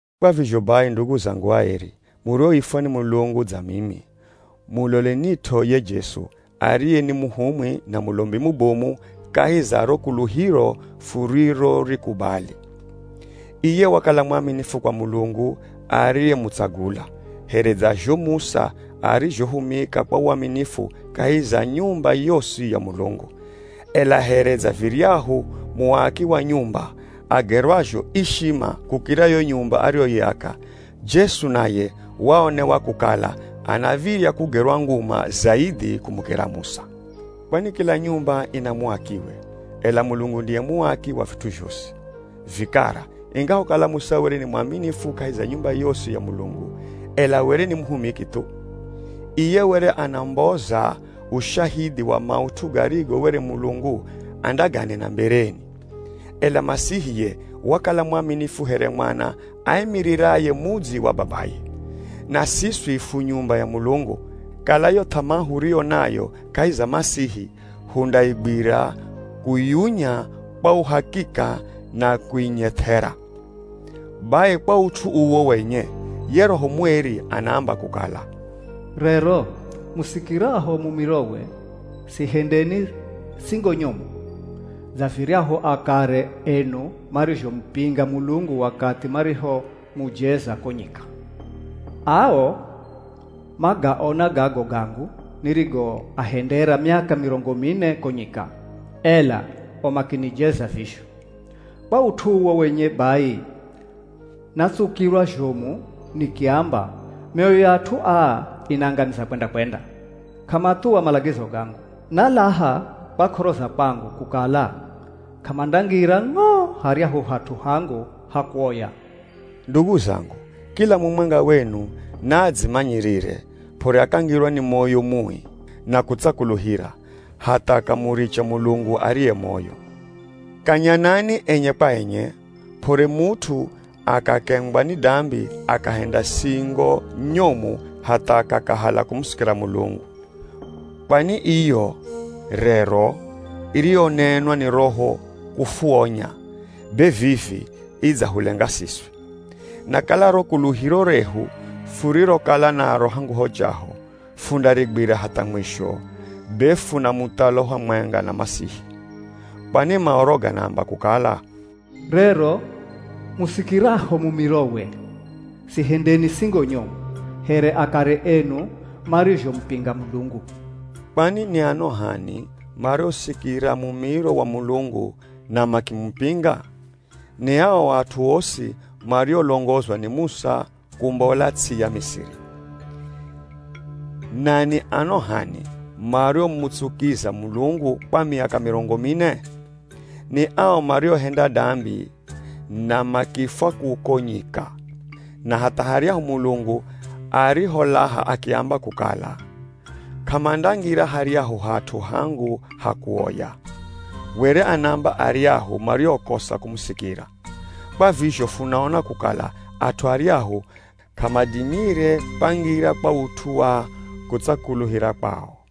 Kwa vizho bai ndugu zangu aeri, murioifwa ni Mulungu dza mimi, mulolenit'o ye Jesu, ariye ni Muhumwi na Mulombi mubomu kahi za ro kuluhiro furirorikubali. Iye wakala mwaminifu kwa Mulungu ariyemutsagula, here dza zho Musa arizhohumika kwa waminifu kahi za nyumba yosi ya Mulungu. Ela here dza viryahu muaki wa nyumba agerwazho ishima kukira yo nyumba ariyoiaka, Jesu naye waonewa kukala anav̱irya kugerwa nguma zaidhi kumukira Musa. Kwani kila nyumba ina muakiwe, ela Mulungu ndiye muaki wa vit'u zhosi. Vikara, ingahokala Musa were ni mwaminifu kahi za nyumba yosi ya Mulungu, ela were ni muhumiki thu. Iye were anamboza ushahidhi wa maut'u garigo were Mulungu andaganena mbereni. Ela Masihi ye wakala mwaminifu here mwana aimiriraye mudzi wa babaye. Na siswi fu nyumba ya Mulungu, kala yo th'amaa huriyo nayo kahi za Masihi hundaigwira kuyunya kwa uhakika na kuinyeth'era. Bai kwa ut'u uwo wenye, ye Roho Mweri anaamba kukala, “Rero musikiraho mumirowe, sihendeni singo nyomu, Dza viryahu akare enu marizhomupinga Mulungu wakathi marihomujeza ko nyika. Ao magaona gago gangu nirigoahendera miaka mirongo mine ko nyika, ela o makinijeza vizho. Kwa ut'u uwo wenye bai, natsukirwa zhomu nikiamba, ‘Myoyo ya at'u aa inaangamiza kwenda-kwenda, k'amathuwa malagizo gangu.’ Nalaha kwa k'oro za kwangu, kukala, ‘K'amandangira ng'o haryahu hat'u hangu ha kuoya.’” Ndugu zangu, kila mumwenga wenu naadzimanyirire p'ore akangirwa ni moyo mui, na kutsakuluhira, hatha akamuricha Mulungu ariye moyo. Kanyanani enye kwa enye, p'ore mut'u akakengwa ni dambi akahenda singo nyomu hatha akakahala kumusikira Mulungu. Kwani iyo “Rero” iriyonenwa ni Roho kufuonya, be vivi idzahulenga siswi. Na kala ro kuluhiro rehu furirokala naro hangu ho chaho, fundarigwira hatha mwisho, be funa muthalo hamwenga na Masihi. Kwani Maoro ganaamba kukala, “Rero musikiraho mumirowe, sihendeni singo nyomu, here akare enu marizhomupinga Mulungu.” Kwani ni ano h'ani mariosikira mumiro wa Mulungu na makimupinga? Ni ao at'u osi mariolongozwa ni Musa kumbola ts'i ya Misiri. Na ni ano h'ani mariomutsukiza Mulungu kwa miaka mirongo mine? Ni ao mariohenda dambi na makifwa kuko nyika. Na hatha haryahu Mulungu ariholaha akiamba kukala “K'amandangira haryahu hat'u hangu ha kuoya,” were anaaamba aryahu mariokosa kumusikira. Kwa vizho funaona kukala at'u aryahu k'amadimire kwangira kwa ut'u wa kutsakuluhira kwao.